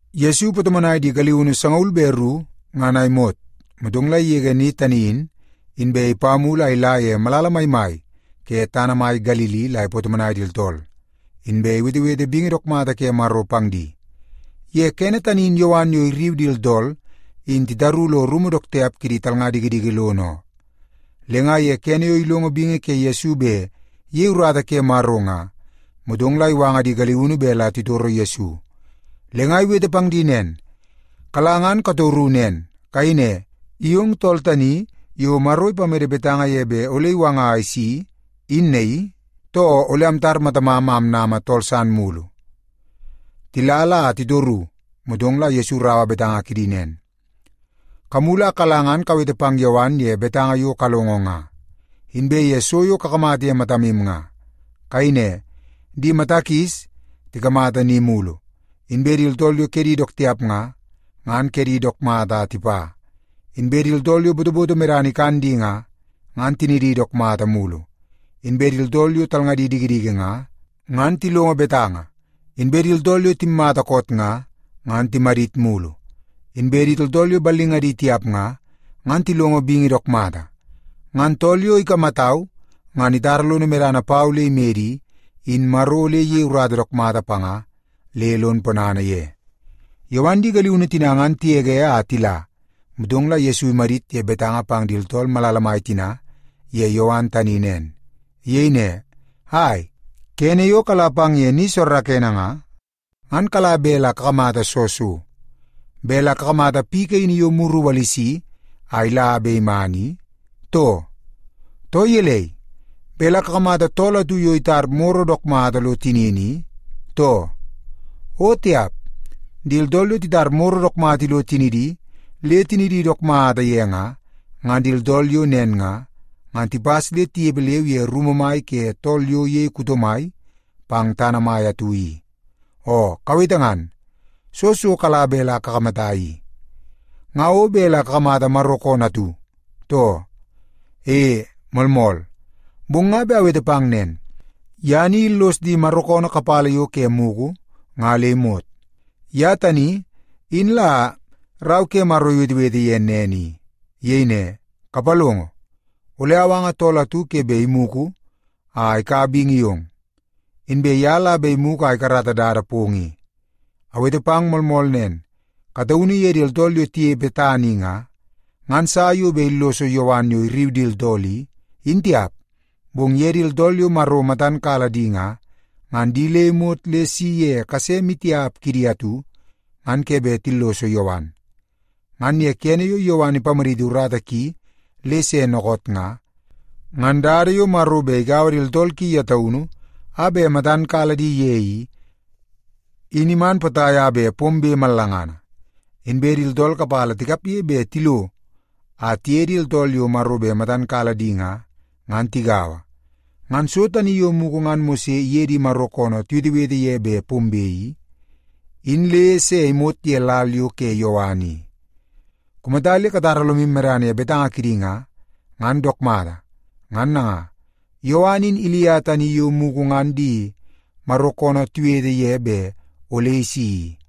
Yesu ipatomonai di galiunu sangaul be ru ngan a imot, motong la igege ni tani in, inbe ipa mulu a ila ye malala maimai ke tana mai Galili la ipatomonai di tooltool, inbe iwetewete bingi dook mata ke Maro pang di. Ye kene tani in Yowan yo irriu di tooltool in titaru lo rumu dook tiap kidi talnga dikidiki lono oo. Le nga ye kene yo ilongo bingi ke Kirisi bet iyei urata ke Maro nga, motong la iwanga di galiunu bet la titoro Yesu. Le nga iwete pang di nen, “Kala ngan katoru nen. Kayei ne, ‘I ong tool tani yo Maro ipamede betanga ye bet ole iwanga a isi, in naii, too ole amtar matamam a amnama tool san mulu?’” Tila la titoru, motong la Yesu iraua betanga kidi nen, “Kamulu a kala ngan kawete pang Yowan ye betanga yo kalongo nga, inbe ye so yo kakamata ye matamu nga. Kayei ne, ‘Di mata kis tikamata ni mulu; inbe di tooltool yo kedi dook tiap nga, ngan kedi dook mata a tipa; inbe di tooltool yo botoboto medana ikan di nga, ngan tinidi dook mata mulu; inbe di tooltool yo talngadi dikidiki nga, ngan tilongo betanga; inbe di tooltool yo timmata koot nga, ngan timadit mulu; inbe di tooltool yo ballingadi tiap nga, ngan tilongo bingi dook mata.’ Ngan tool yo ikamatau ngan itara lono medana pau le imede i, in Maro ole iyei urata dook mata panga le lon ponana ye.” Yowan di galiunu tina ngan tigege a tila, motong la Yesu imadit ye betanga pang di tooltool malala mai tina ye Yowan tani nen. Iyei ne, “Ai, kene yo kala pang ye ni soorookoonoo nga, ngan kala bet la kakamata soo so? Bet la kakamata piu kaini yo muru iwalisi a ila bet iman i, too? Too gelei, bet la kakamata tool atu yo itar moro dook mata lo tinini i, too? O tiap! Di tooltool yo titar moro dook mata ilo tinidi le tinidi dook mata ye nga, ngan di tooltool yo nen nga, ngan tipas le tinepe leu ye rumu mai ke tool yo iyei kuto mai pang tana mai atu i. Oo kawete ngan, soo so kala bet la kakamata i? Nga o bet la kakamata Maro koonoo atu, too? E, moolmool. Bong nga bet awete pang nen, ye ni illos di Maro koonoo kapala yo ke mugu nga le imot. Ye tani in la Rau ke Maro iwetewete ye nen i. Iyei ne, ‘Kapalongo! Ole awanga tool atu ke bet imugu a ikaua bingi yong. Inbe ye la bet imugu a ikarata dada pong i.’ Awete pang moolmool nen, kataunu ye di tooltool yo tinepe tana i nga, ngan sa yo bet illoso Yowan yo irriu di tooltool i, in tiap. Bong ye di tooltool yo Maro matan kala di nga, ngan di le imot le isi ye kase maitiap kidi atu, ngan ke bet tilloso Yowan. Ngan ye kene yo Yowan ipamaditi urata ki le se dookoot nga, ngan dada yo Maro bet igaua di tooltool ki ye taunu a bet matan kala di ye i, in iman potai a bet pombe mallangana. Inbe di tooltool kapala tikapge bet tilo a tiye di tooltool yo Maro bet matan kala di nga, ngan tigaua. Ngan so tani yo mugu ngan Mose iye di Maro koonoo tiwetewete ye bet pombe i, in le se imot ye lal yo ke Yowan i. Kumata le katara lomu medana ye betanga kidi nga, ngan dook mata. Ngan nanga, Yowan in Ilia tani yo mugu ngan di Maro koonoo tiwetewete ye bet ole isi i.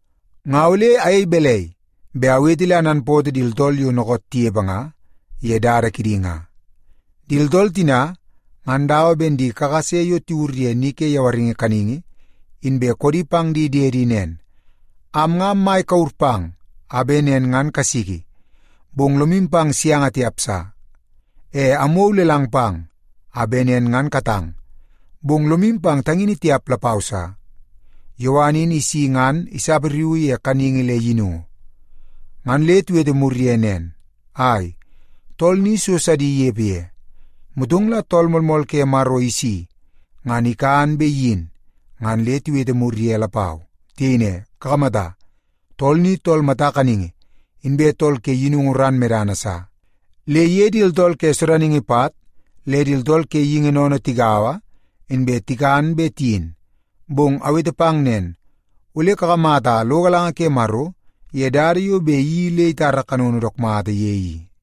“Nga ole ayei balai bet awete le ananpootoo di tooltool yo dookoot tinepe nga ye dada kidi nga? Di tooltool tina, ngan dawa ben di kakase yo tiwur ye ni ke yawaringi kaningi, inbe koodi pang di diedi nen, ‘Am nga ammai kure pang a bet nen ngan kasiki, bong lomu pang sianga tiap sa. E amwou lelang pang a bet nen ngan katang, bong lomu pang tangini tiap lapau sa.’ Yowan in isi ngan isapariuu ye kaningi le yinungu. Ngan le tiwete mur ye nen, ‘Ai, tool ni so sidi inepe ye.’ Motong la Tool Moolmool ke Maro isi, ngan ikan bet iyin ngan le tiwete mur ye lapau. Tiyei ne, ‘Kakamata, tool ni tool mata kaningi inbe tool ke yinungu ran medana sa. Le iye di tooltool ke sodaningi pat le tooltool ke geingi sennene tigaua, inbe tikan be tiyin.’ Bong awete pang nen, ole kakamata lo galanga ke Maro ye dada yo bet iyeii le itara kanono dook mata ye i.”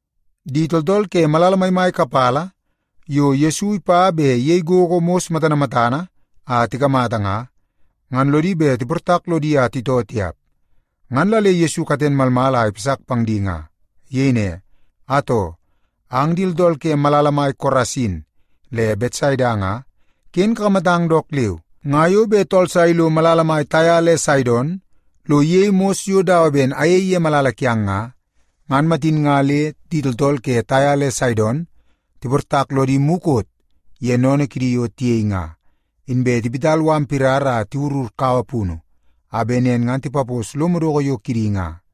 Di tooltool ke malala maimai kapala yo Yesu ipa bet iyei gogo mos matana matana a tikamata nga, ngan lodi bet tiportak lodi a titoo tiap. Ngan la le Yesu katen malmal a ipasak pang di nga. Iyei ne, “Atoo, ang di tooltool ke malala mai Korasin le Betsaida nga, ken kakamatang dook leu. Nga yo bet tool sa ilo malala mai Taia le Saidon lo iyei mos yo dawa ben ayei ye malala kiang nga, ngan matin nga le di tooltool ke Taia le Saidon tiportak lodi mukot ye sennene kidi yo tiyei nga, inbe tiwit mala pirara a tiwurur kaua punu a bet nen ngan tipapos lo madoko yo kidi nga.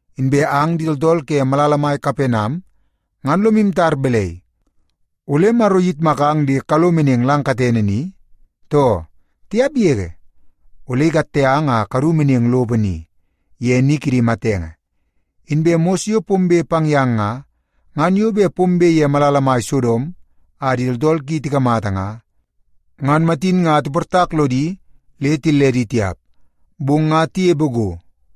Inbe ang di tooltool ke malala mai Kapenam ngan lomu tar balai, ole Maro iyitmakang le kalo meneng lang katene ni, too? Tiap yege! Ole ikatte ang kadu meneng lopo ni, ye ni kidi matenge. Inbe mos yo pombe pang yang nga, ngan yo bet pombe ye malala mai Sodom a di tooltool ki tikamata nga, ngan matin nga tiportak lodi le tilledi tiap, bong nga tinepe go.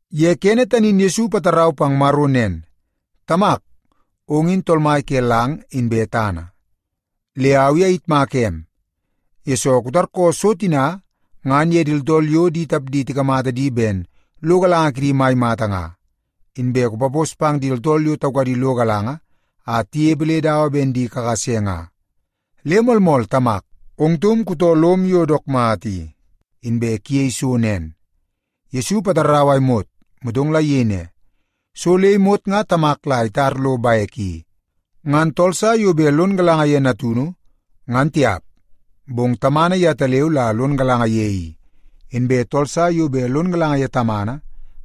Ye kene tani in Yesu ipatarau pang Maro nen, “Tamak, ong in Tool Mai ke lang inbe tana. Le au i ayitmaka em, yesoo kutarkoo so tina ngan ye di tooltool yo di tapdi tikamata di ben lo galanga kidi mai mata nga, inbe kupapos pang di tooltool yo taukadi lo galanga a tinepe le dawa ben di kakase nga. Le moolmool Tamak, ong taum kutoo lom yo dook mata i, inbe kuyei so nen.” Yesu ipatarau a imot, motong la iyei ne, “So le imot nga Tamak la itar lo bek i. Ngan tool sa yo bet lon galanga ye Natunu, ngan tiap, bong Tamana yetaleu la lon galanga ye i. Inbe tool sa yo bet lon galanga ye Tamana,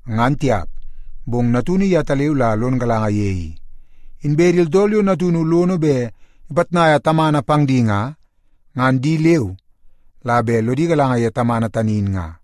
ngan tiap, bong Natunu yetaleu la lon galanga ye i. Inbe di tooltool yo Natunu lono bet ipitnaia Tamana pang di nga, ngan di leu la bet lodi galanga ye Tamana tani in nga.”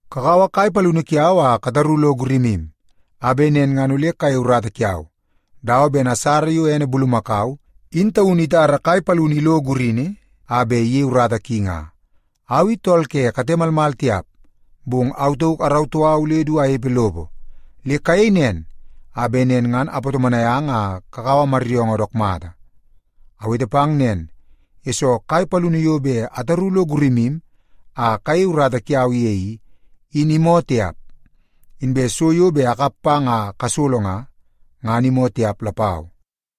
Kakaua kai palini kiau a kataru lo gurimu a bet nen ngan ole kayei urata kiau, dawa ben asara yo ene bulumakau in taunu itara kai palini ilo gurini a bet iyei urata ki nga. Au i tool ke kate malmal tiap, bong au tauk arautoo au le du anepe lopo. Le kayei nen, a bet nen ngan apatomonai ang a kakaua maryoongoo dook mata. Awete pang nen, yesoo kai palini yo bet ataru lo gurimu a kayei urata kiau ye i, in imoo tiap. Inbe so yo bet akap pang a kasolo nga, ngan imoo tiap lapau.”